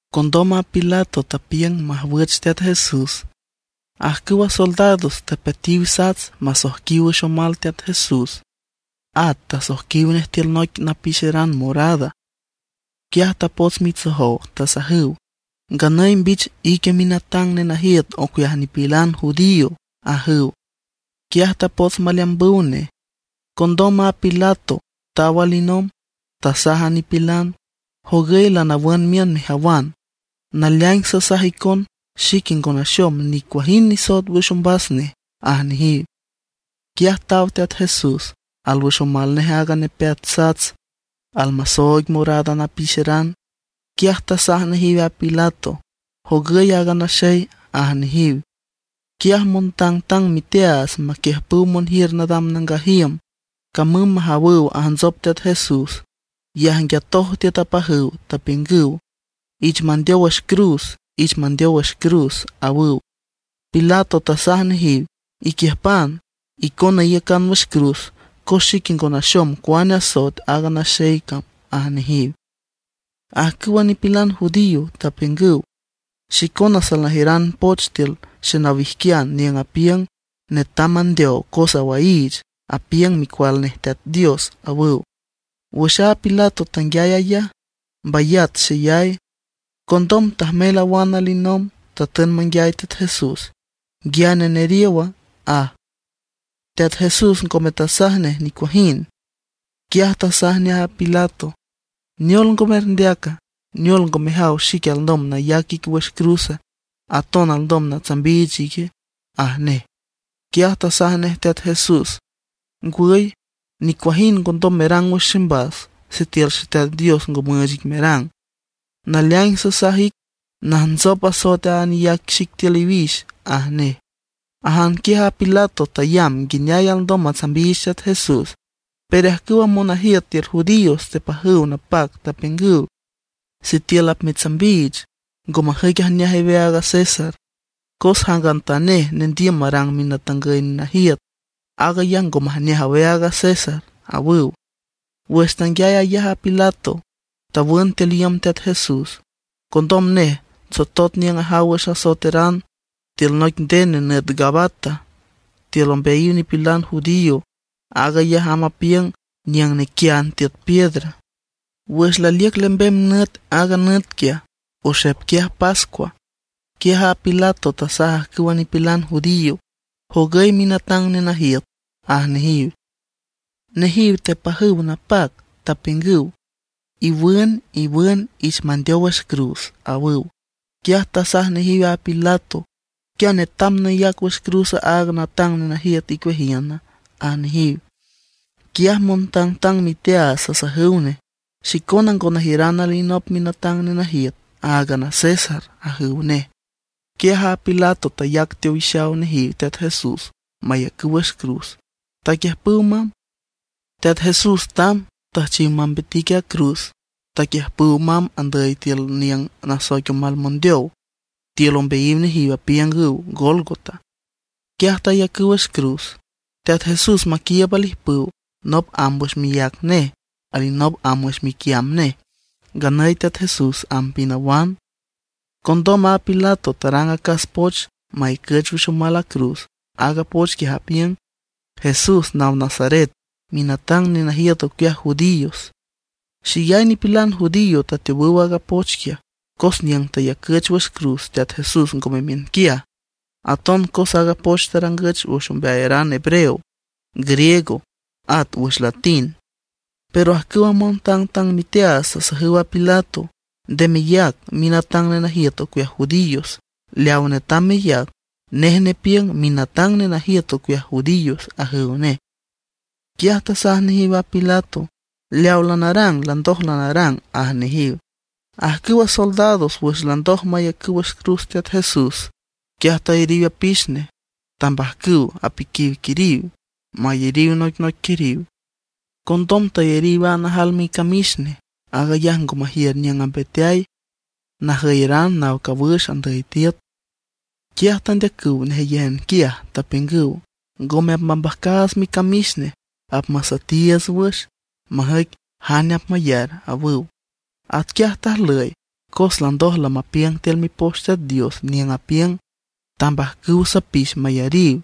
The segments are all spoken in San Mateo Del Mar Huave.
Condom a Pilato tapiüng majwüch Teat Jesús. Ajcüwa soldados tapeatiw sats masoijquiw wüx omal Teat Jesús. At tasoijquiw nej tiül noic napixeran morada. Quiaj tapots mitsojow, tasajüw: ―¡Nganüy mbich ique minatang nenajiüt ocueaj nipilan judío! ―ajüw. Quiaj tapots maleambüw nej. Condom a Pilato taw alinomb, tasaj a nipilan: ―Jogüy lanawün miün mejawan, naleaing sasaj icon xique ngo naxom nicuajind nisoet wüx ombas nej ―aj nejiw. Quiaj taw Teat Jesús, alwüx omal nej aaga nepeat sats, at almasooig morada napixeran. Quiaj tasaj nejiw a Pilato: ―¡Jogüy aaga naxey! ―aj nejiw. Quiaj montangtang miteaats maquiüjpüw monjiür nadam nangaj iüm camüm majawüw ajntsop Teat Jesús, yajnguiatoj tiüt apajüw, tapiüngüw: ―¡Ich mandeow wüx cruz! ¡Ich mandeow wüx cruz! ―awüw. Pilato tasaj nejiw: ―Iquiüjpan, icona iyacan wüx cruz, cos xique ngo naxom cuane asoet aaga naxey cam ―aj nejiw. Ajcüwa nipilan judío tapiüngüw: ―Xicona salnajiüran poch tiül xenawijquian niüng apiüng netam mandeow cos awaiich, apiüng Micual nej Teat Dios ―awüw. Wüx a Pilato tanguiay aag ayaj, mbayat xeyay. Condom tajmel awan alinomb, tatün manguiay Teat Jesús: ―¿Nguiane neriowa? ―aj. Teat Jesús ngome tasaj nej nicuajind. Quiaj tasaj nej a Pilato: ―¿Neol ngo merndeaca? ¿Neol ngo mejaw xique alndom nayac ic wüx cruz, aton alndom natsambiich ique? ―aj nej. Quiaj tasaj nej Teat Jesús: ―Ngwüy, nicuajind ngondom merang wüx ximbas sitiül Xeteat Dios ngo müüch ic merang. Naleaing sasaj ic, najntsop asoet aaga neyac xic tiül iwix ―aj nej. Ajan quiaj a Pilato tayamb nguineay alndom matsambiich Teat Jesús, pero ajcüwa monajiüt tiül judíos tepajüw napac, tapiüngüw: ―¡Sitiül apmetsambiich, ngo majüic ijneaj aweaag a César; cos jangantanej nendiüm marang minatangüy nenajiüt, aag ayaj ngo majneaj aweaag a César! ―awüw. Wüx tanguiay aag ayaj a Pilato tawün tiül iüm Teat Jesús. Condom nej tsotot niüng ajaw wüx asoeteran, tiül noic nden nenüt Gabata tiül ombeayiw nipilan judío. Aag ayaj amb apiüng niüng nequiand tiüt piedra. Wüx laliüc lembem nüt aaga nüt quiaj, oxep quiaj pascua, quiaj a Pilato tasaj ajcüwa nipilan judío: ―¡Jogüy minatang nenajiüt! ―aj nejiw. Nejiw tepajüw napac, tapiüngüw: ―¡Iwün, iwün, ich mandeow wüx cruz! ―awüw. Quiaj tasaj nejiw a Pilato: ―¿Quia netam nayac wüx cruz aaga natang nenajiüt icueajiüna? ―aj nejiw. Quiaj montangtang miteaats tasajüw nej: ―¡Xicona ngo najiüran alinop minatang nenajiüt, áagan a César! ―ajüw nej. Quiaj a Pilato tayac teowixaw nejiw Teat Jesús mayacüw wüx cruz, taquiüjpüw mamb. Teat Jesús tamb, tüjchiw mambitic a cruz. Taquiüjpüw mamb andüy tiül niüng nasoic omal mondeow. Tiül ombeayiw nejiw apiüngüw Gólgota. Quiaj tayacüw wüx cruz Teat Jesús maquiiüb alijpüw. Nop amb wüx miác nej, alinop amb wüx miquiamb nej; nganüy Teat Jesús amb pinawan. Condom a Pilato tarang acas poch mayacüch wüx omal a cruz. Aaga poch quiaj apiüng: “Jesús naw Nazaret, minatang nenajiüt ocueaj judíos.” Xeyay nipilan judío tateowüw aaga poch quiaj, cos niüng tayacüch wüx cruz Teat Jesús ngome miünquiaj, aton cos aaga poch tarangüch wüx ombeayaran hebreo, griego, at wüx latín. Pero ajcüwa montangtang miteaats tasajüw a Pilato: ―Nde meyac: “Minatang nenajiüt ocueaj judíos.” Leaw netam meyac: “Nej nepiüng minatang nenajiüt ocueaj judíos,” ―ajüw nej. Quiaj tasaj nejiw a Pilato: ―Leaw lanarang landoj lanarang ―aj nejiw. Ajcüwa soldados wüx landoj mayacüw wüx cruz Teat Jesús, quiaj tayariw apix nej, tambajcüw apiquiw quiriw mayariw noicnoic quiriw. Condom tayariw a najal micamix nej, aag ayaj ngo majiür niüng ambeteay, najüyeran naw cawüx andüy tiüt. Quiaj tandeacüw nejeyéjan quiaj, tapiüngüw: ―Ngome apmambajcaats micamix nej, apmasüetiiüts wüx, majüic jane apmayar ―awüw. Atquiaj tajlüy cos landoj lamapiüng tiül Mipoch Teat Dios, niüng apiüng: “Tambajcüw sapix mayariw,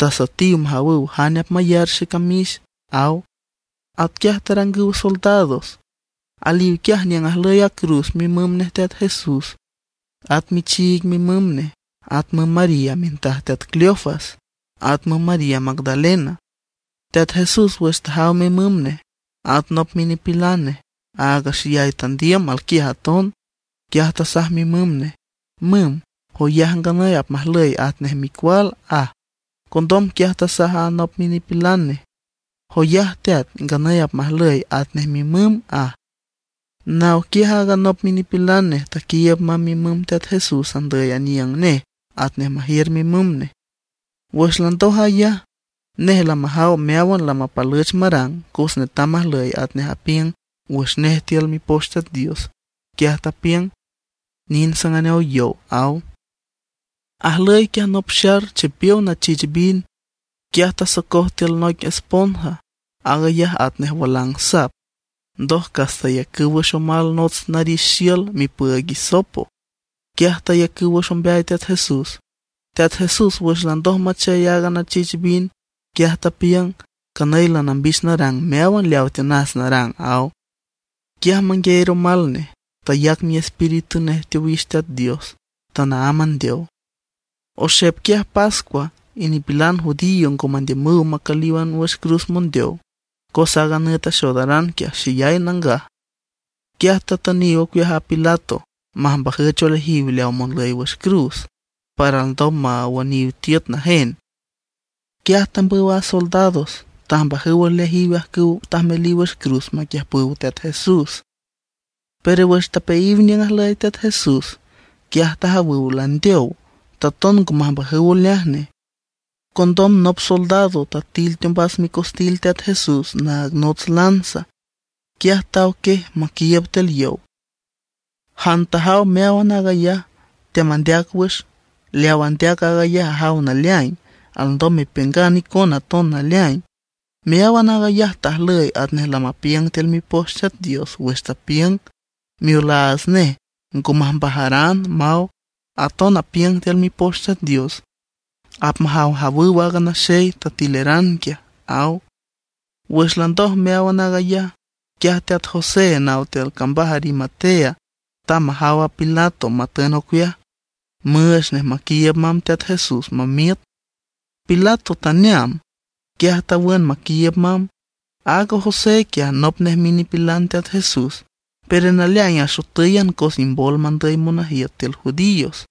tasüetiw majawüw jane apmayar xecamix”, aw. Atquiaj tarangüw soldados. Aliw quiaj niüng ajlüy a cruz mimüm nej Teat Jesús, at michiig mimüm nej; at müm María mintaj teat Cleofas, at müm María Magdalena. Teat Jesús wüx tajaw mimüm nej, at nop minipilan nej, aaga xeyay tandiüm alquiaj aton, quiaj tasaj mimüm nej: ―Müm, joyaj nganüy apmajlüy atnej micual ―aj. Condom quiaj tasaj aaga nop minipilan nej: ―Joyaj teat, nganüy apmajlüy atnej mimüm ―aj. Naw quiaj aaga nop minipilan nej taquiiüb mamb mimüm Teat Jesús andüy aniüng nej atnej majiür mimüm nej. Wüx landoj aag ayaj, nej lamajaw meáwan lamapalüch marang. Cos netam majlüy atnej apiüng wüx nej tiül Mipoch Teat Dios, quiaj tapiüng: ―Nind sanganeow yow ―aw. Ajlüy quiaj nop xar chipiow nachich vino, quiaj tasocoj tiül noic esponja, aag ayaj atnej walang sap. Ndoj cas tayacüw wüx omal nots narix xiül mipüüig hisopo. Quiaj tayacüw wüx ombeay Teat Jesús. Teat Jesús wüx landoj machey aaga nachich vino, quiaj tapiüng: ―Canüy lanambich narang meáwan leawa tiünas narang ―aw. Quiaj manguieer omal nej; tayac miespíritu nej teowix Teat Dios; tanaámb andeow. Oxep quiaj pascua, y nipilan judío ngo mandiümüw macǘlan wüx cruz mondeow, cos aaga nüt axoodaran quiaj xeyay nangaj. Quiaj tatüniw ocueaj a Pilato majmbajüch oleajiw leaw monlüy wüx cruz para alndom mawüniw tiüt najen. Quiaj tambüw a soldados tajmbajüw oleajiw ajcüw tajmeliw wüx cruz maquiüjpüw Teat Jesús. Pero wüx tapeayiw niüng ajlüy Teat Jesús, quiaj tajawüw landeow, taton ngo majmbajüw oleaj nej. Condom nop soldado tatil teombas micostil Teat Jesús naag nots lanza, quiaj taw quiej maquiiüb tiül yow. Jan tajaw meáwan aag ayaj teamandeac wüx; leawa andeac aag ayaj ajaw naleaing. Alndom mepiüngan icona aton naleaing. Meáwan aag ayaj tajlüy atnej lamapiüng tiül Mipoch Teat Dios wüx tapiüng: “Miolaats nej ngo majmbajaran”, maw. Aton apiüng tiül Mipoch Teat Dios: “Apmajawjawüw aaga naxey tatileran quiaj”, aw. Wüx landoj meáwan aag ayaj, quiaj teat José naw tiül cambaj Arimatea tamb majaw a Pilato matün ocueaj, müüch nej maquiiüb mamb Teat Jesús mamiüt. Pilato taneam, quiaj tawün maquiiüb mamb. Aaga José quiaj nop nej minipilan Teat Jesús, pero naleaing axotǘyan cos imbol mandüy monajiüt tiül judíos.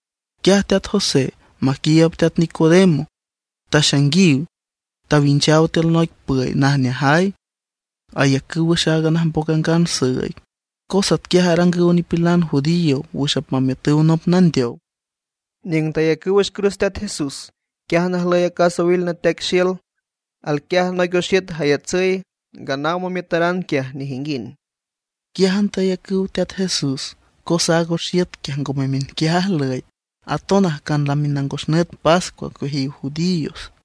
Quiaj teat José maquiiüb teat Nicodemo taxainguiw, tawinchaw tiül noic püy najneajay, ayacüw wüx aaga najmboc angan süüig, cos atquiaj arangüw nipilan judío wüx apmamiütüw nop nandeow. Niüng tayacüw wüx cruz Teat Jesús, quiájan ajlüy acas owil nateaic xiül. Alquiaj noic oxiüt jayatsüy, nganaw mamiütaran quiaj nejinguind. Quiájan tayacüw Teat Jesús, cos aaga oxiüt quiaj ngome miünquiaj ajlüy, aton ajcan lami nangos nüt pascua ocueajiw judíos.